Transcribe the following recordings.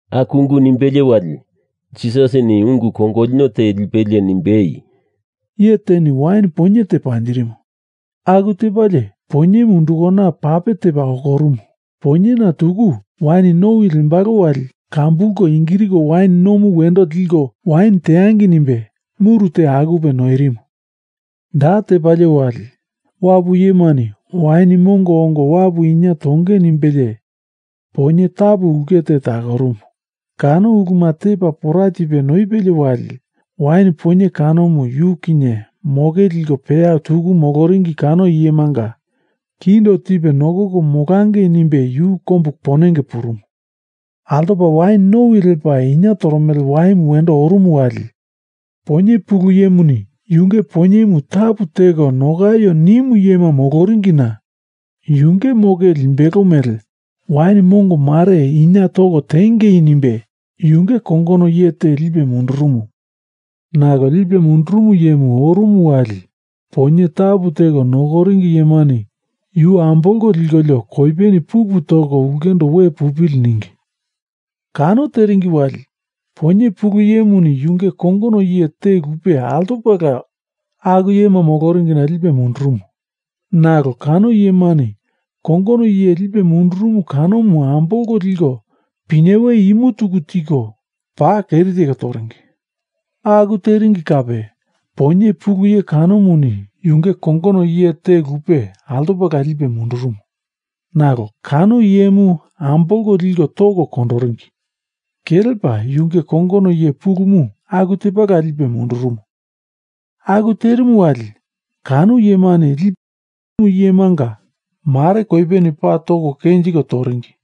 Aku ungu nimbelie wali Jisasini ungu kongolino te lipelie nimbei, “Iye teni wain poinye te panjirimu. Aku tepalie poinyemu undukana pape tepa okorumu. Poinyena tuku wain nowi lembalo wali kambulko ingiriko wain nomu wendo liko wain teangei nimbe muru te akupe noirimu. Da tepalie wali wapu iyemani wain mongo ongo wapu inie tonge nimbelie poinye tapu ulke te takorumu. Kano uluma tepa pora tipe noipelie wali, wain poinye kanomu yu kinye moke liko peya tuku moloringi kano iyemanga kindo tipe nokoko molangei nimbe yu kombu ponenge purumu. Altopa wain nowi lepa inie toromele waimu wendo orumu wali, poinye pulu iyemuni yunge poinyemu tapu teko nokaio nimu iyema moloringina yunge moke limbelo mele wain mongo mare inya toko tiengei nimbe yunge kongono iye te lipe mundurumu. Nalo lipe mundurumu iyemu orumu wali poinye tapu teko nokoringi iyemani yu ambolko likolio koipeni pupu toko ulkendo we pupili ningi. Kano teringi wali poinye pulu iyemuni yunge kongono iye te lupe altopala aku iyema moloringina lipe mundurumu. Nalo kano iyemani kongono iye lipe mundurumu kanomu ambolko liko pinyewe imu tuku tiko paa keri teko toringi. Aku teringi kape poinye pulu iye kanomuni yunge kongono iye te lupe altopala lipe mundurumu, nalo kano iyemu ambolko liko toko kondoringi. Kelepa yunge kongono iye pulumu aku tepala lipe mundurumu. Aku terimu wali, kano iyemani lipe mundurumu iyemanga mare koipeni paa kenjiko toringi,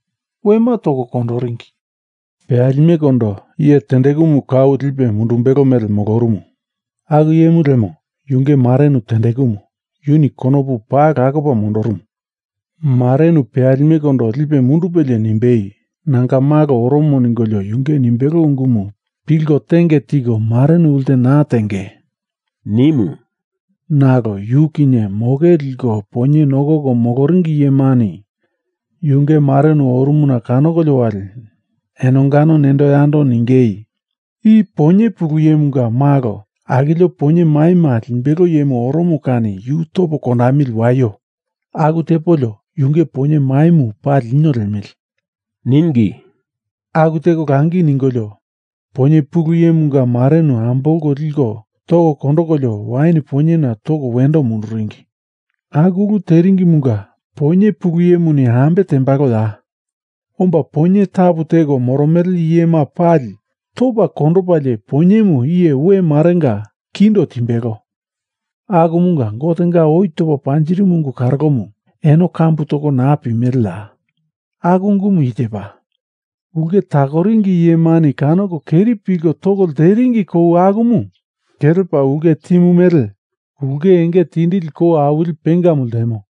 wema toko kondoringi. Peyalimekondo iye tendekumu kau lipe mundumbelo mele molorumu. Aku iyemu lemo yunge marenu tendekumu. Yuni konopu paa lakopa mondorumu. Marenu peyalimekondo lipe mundupelie nimbei, ‘Nanga malo oromo ningolio yunge nimbelo ungumu pilko tenge tiko marenu ulte naa tengei,’ nimu. Nalo yu kinye moke liko poinye nokoko moloringi iyemani yunge marenu orumuna kanokolio wali enongano nendo yando ningei, ‘I poinye pulu iyemunga malo akilio poinye maima limbelo iyemu oromo kani yu topo kondamili waio. Aku tepolio yunge poinye maimu pali lino liemili,’ ningi. Aku teko langi ningolio, poinye pulu iyemunga marenu ambolko liko toko kondokolio wain poinyena toko wendo munduringi. Aku ulu teringimunga poinye pulu iyemuni ambe tembaloya? Omba poinye tapu teko moromele iyema pali topa kondopalie poinyemu iye we marenga kindo timbelo. Akumunga Gotenga oi topa panjirimu ungu karolomu eno kambu toko naa pimeleya? Aku ungumu i tepa, Ulke takoringi iyemani kanoko keri pilko toko lteringi kou akumu kelepa ulke timu mele ulke enge tindili kou awili pengamu ltemo,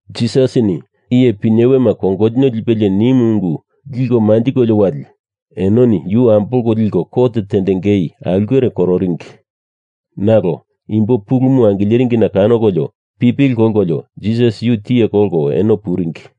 Jisasini iye pinyewema kongolino lipelie nimu ungu liko manjikolio wali enoni yu ambolko liko kot tendengei aulkere kororingi. Nalo imbo pulumu angileringina kanokolio pipili kolkolio Jisas yu tiye kolko eno puringi.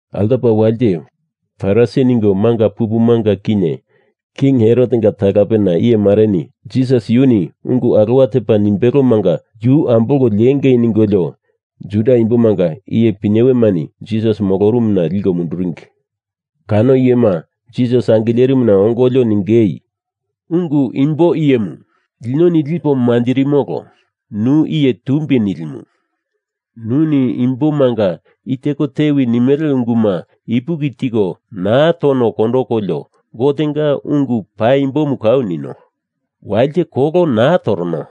Altopa walite Farisi ningo manga pupumunga kinye King Herotenga talapena iyemareni Jisas yuni ungu alowa tepa nimbelomanga yu ambolko liengei ningolio Juda imbomanga iye pinyewemani Jisas molorumuna liko munduringi. Kano iyema Jisas angilerimuna ongolio ningei, “Ungu imbo iyemu, linoni lipo manjirimolo, nu iye tumbi nilimu. Nuni imbomanga i teko tewi nimele unguma ipuki tiko naa tono kondokolio Gotenga ungu paimboma kau nino. Walite kolo naa torono.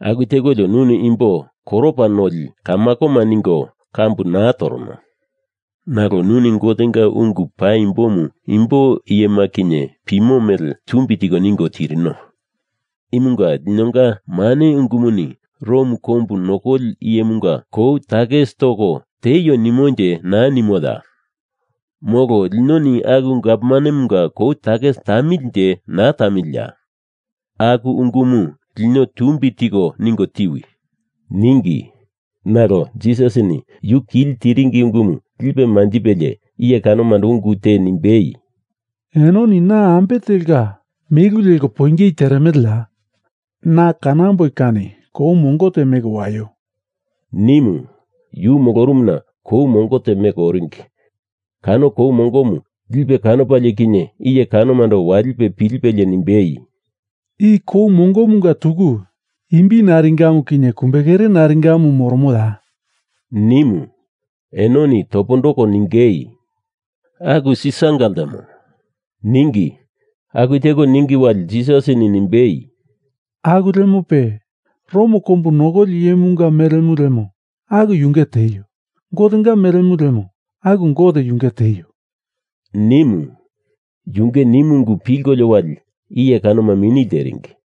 Aku tekolio nuni imbo koropa noli kamakoma ningo kambu naa torono. Nalo nuni Gotenga ungu paimbomu imbo iyema kinye pimo mele tumbi tiko ningo tirino. Imunga linonga mane ungumuni Rom kombu nokoli iyemunga kou takis toko tieio nimonje naa nimoya? Molo linoni aku gavmanemunga kou takis tamilinje naa tamiliya? Aku ungumu lino tumbi tiko ningo tiwi,” ningi. Nalo Jisasini yu kili tiringi ungumu lipe manjipelie iye kanomando ungu te nimbei, “Enoni na ambe telka melu leko poingei teremeleya? Na kanamboi kani kou mongo te meko waio,” nimu. Yu molorumuna kou mongo te meko oringi. Kano kou mongomu lipe kanopalie kinye iye kanomando walipe pilipelie nimbei, “I kou mongomunga tuku imbi naringamu kinye kumbekere naringamu moromoya?” nimu. Enoni topondoko ningei, “Aku Sisaranga ltemo,” ningi. Aku teko ningi wali Jisasini nimbei, “Aku lemope, Rom kombu nokoli iyemunga melemu lemo aku yunge tieio. Gotenga melemu lemo aku Gote yunge tieio,” nimu. Yunge nimu ungu pilkolio wali iye kanoma mini lteringi.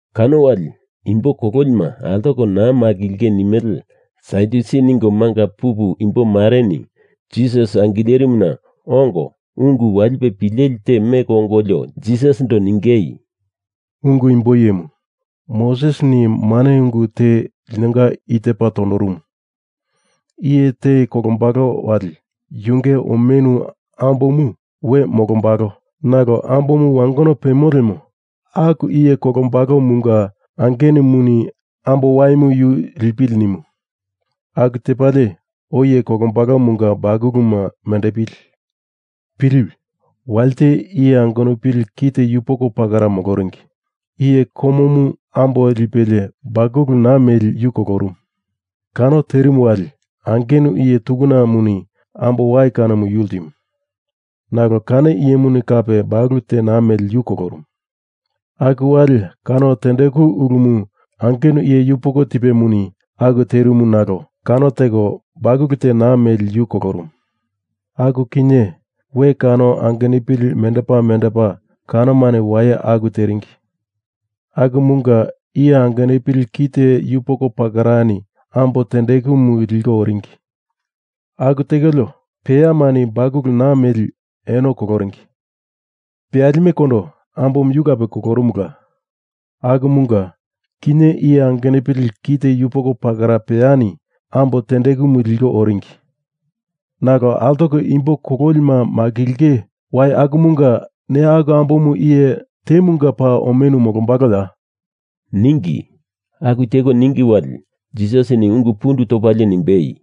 Kano wali imbo kololima altoko naa makilinge nimele Sadyusi ningomanga pupu imbo mareni Jisas angilerimuna ongo ungu walipe pileli temeko ongolio Jisasindo ningei, “Ungu imbo iyemu, Mosesini mane ungu te linonga i tepa tondorumu. Iye te kolombalo wali yunge omenu ambomu we molombalo nalo ambomu wangono pemo lemo, aku iye kolombalomunga angenumuni ambo waimu yu lipili nimu. Aku tepalie oi iye kololimunga bakuluma mendepili. Piliwi. Walite iye angenupili kite yupoko pakera moloringi. Iye komomu ambo lipelie bakulu naa meli yu kolorumu. Kano terimu wali angenu iye tukunamuni ambo wai kanomu yu ltimu. Nalo kano iyemuni kape bakulu te naa meli yu kolorumu. Aku wali kano tendeku ulumu angenu iye yupoko tipemuni aku terimu nalo kano teko bakulu te naa meli yu kolorumu. Aku kinye we kano angenupili mendepa mendepa kanomani waye aku teringi. Akumunga iye angenupili kite yupoko pakerani ambo tendekumu liko oringi. Aku tekolio, peyamani bakulu naa meli eno koloringi. Peyalimekondo ambomu yu kape kolorumula. Akumunga, kinye iye angenupili kite yupoko pakera peyani ambo tendekumu liko oringi. Nalo altoko imbo kololima makilinge wai akumunga ne aku ambomu iye temunga paa omenu molombaloya?” ningi. Aku teko ningi wali, Jisasini ungu pundu topalie nimbei,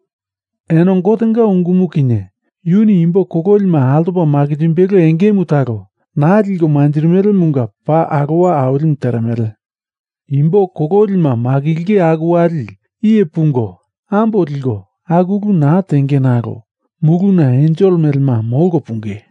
“Eno Gotenga ungumu kinye yuni imbo kololima altopa makinjimbelo engemu talo naa liko manjirimelemunga paa alowa awilimu teremele! Imbo kololima makilinge aku wali iye pungo ambo liko aku ulu naa tenge nalo muluna ensel melema molko punge.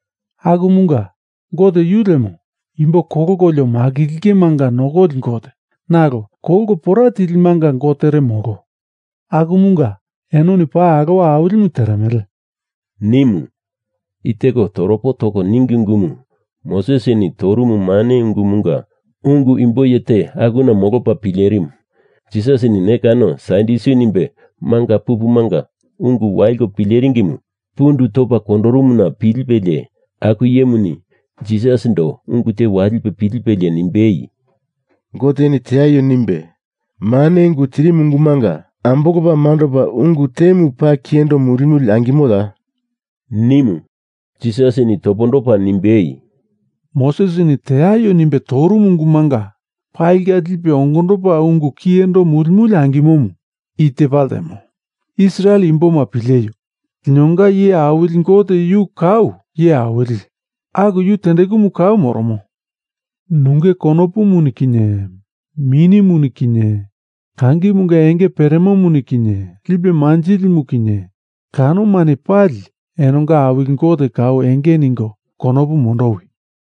Akumunga Gote yu lemo imbo kolkolio makilingemanga nokoli Gote, nalo kolko pora tilimanga gotere, molo. Akumunga enoni paa alowa awilimu teremele!” nimu. I teko toropo toko ningi ungumu Mosesini torumu mane ungumunga ungu imbo iye te akuna molopa pilerimu. Jisasini ne kano Sadyusi nimbe manga pupumunga ungu waliko pileringimu pundu topa kondorumuna pilipelie aku iyemuni Jisasindo ungu te walipe pilipelie nimbei, “Goteni teaio nimbe mane ungu tirimu ungumanga ambolopa mandopa ungu temu paa kiyendo mulimuli angimoya?” nimu. Jisasini topondopa nimbei, “Mosesini teaio nimbe torumu ungumanga palinga lipe ongondopa ungu kiyendo mulimuli angimomu i tepa ltemo, Israel imboma pileio. Linonga iye awili Gote yu kau iye awili aku yu tendekumu kau moromo. Nunge konopumuni kinye minimuni kinye kangimunga enge peremomuni kinye lipe manjilimu kinye kanomani pali enonga Awili Gote kau enge ningo konopu mondowi!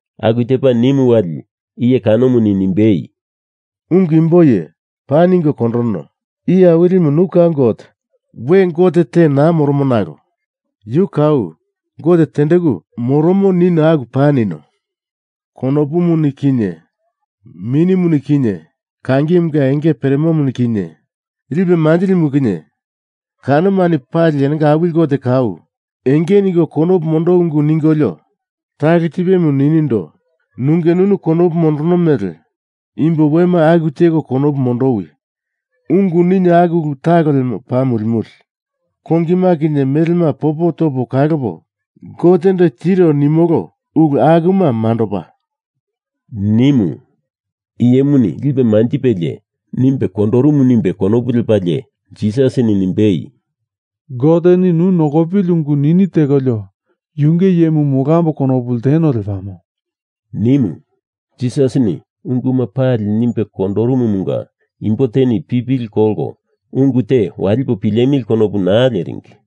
Aku tepa nimu wali, iye kanomuni nimbei, “Ungu imbo iye, paa ningo kondorono. Iye awilimu yu kau Gote, we gote te naa moromo nalo yu kau Gote tendeku moromo nino aku paa nino. Konopumuni kinye minimuni kinye kangimunga enge peremomuni kinye lipe manjilimu kinye kanomani pali enonga Awili Gote kau enge ningo konopu mondowi ungu ningolio talo tipemu ninindo nunge nunu konopu mondorono mele imbo wema aku teko konopu mondowi ungu nino aku ulu talo lemo paa mulimuli. Kongima kinye melema popo topo kalopa Gotendo tiro nimolo ulu akuma mandopa,” nimu. Iyemuni lipe manjipelie nimbe kondorumu nimbe konopu lepalie Jisasini nimbei, “Goteni nu nokopili ungu nini tekolio yunge iyemu molambo konopu lteno lepamo,” nimu. Jisasini unguma pali nimbe kondorumumunga imbo teni pipili kolko ungu te walipo pilemili konopu naa leringi.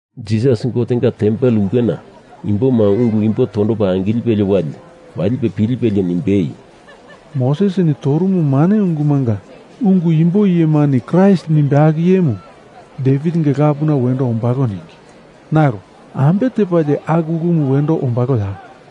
Jisas Gotenga tempel ulkena imboma ungu imbo tondopa angilipelie wali walipe pilipelie nimbei, “Mosesini torumu mane ungumunga ungu imbo iyemani Kraist nimbe aku iyemu Devitinga lapuna wendo ombalo ningi, nalo ambe tepalie aku ulumu wendo ombaloya?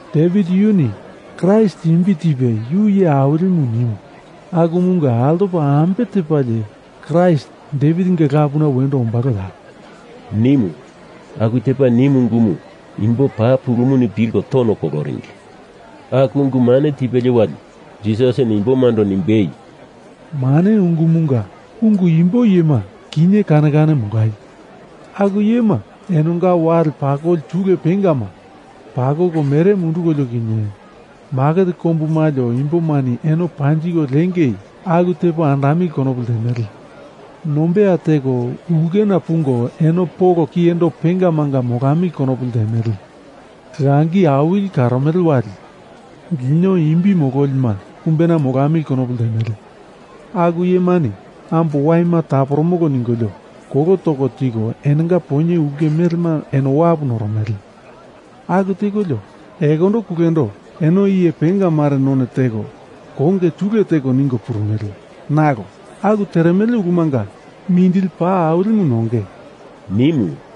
Devit yuni Kraist imbi tipe yu iye awili nimu akumunga altopa ambe tepalie Kraist Devitinga lapuna wendo ombaloya?” nimu. Aku tepa nimu ungumu imbo paa pulumuni pilko tono koloringi. Aku ungu mane tipelie wali, Jisasini imbomando nimbei, “Mane ungumunga ungu imbo iyema kinye kane kane molaio. Aku iyema enonga wale pakoli tule pengama pakoko mere mundukolio kinye maket kombu malio imbomani eno panjiko lengei aku tepo andamili konopu ltemele. Nombeya teko ulkena pungo eno polo kiyendo pengamanga molamili konopu ltemele. Langi awili kaloromele wali lino imbi mololi kumbena molamili konopu ltemele. Aku iyemani ambo waima taporomolo ningolio kolo toko tiko enonga poinye ulke melema eno wapu noromele. Aku tekolio, ekondo kulendo eno iye penga mare none teko konge tule teko ningo purumele. Nalo aku teremele ulumanga mindili paa awilimu nonge,” nimu.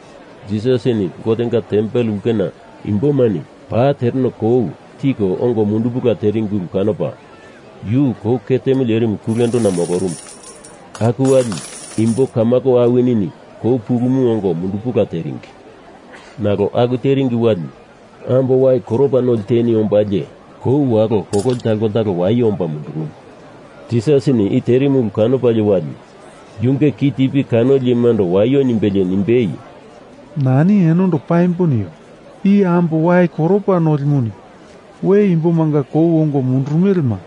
Jisasini Gotenga tempel ulkena imbomani paa tereno kou tiko ongo mundupula teringi ulu kanopa, yu kou ketemu lerimu kulendona molorumu. Aku wali, imbo kamako awinini kou pulumu ongo mundupula teringi. Nalo aku teringi wali, ambo wai koropa noli teni ombalie kou walo kololi talo koltalo waye omba mundurumu. Jisasini i terimu ulu kanopalie wali yunge kitipi kanoli iyemando waio nimbelie nimbei, “Nani enondo paimbo nio. I ambo wai koropa nolimuni we imbomanga kou ongo mundurumelema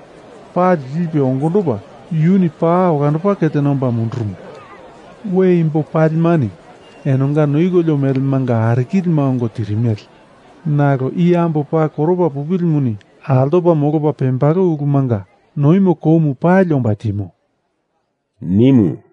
pali lipe ongondopa yuni paa olandopa ketena omba mundurumo. We imbo palimani enonga noikolio melemanga arikilima ongo tirimele, nalo i ambo paa koropa pupilimuni altopa molopa pembalo ulumunga noimo koumu pali omba timo,” nimu.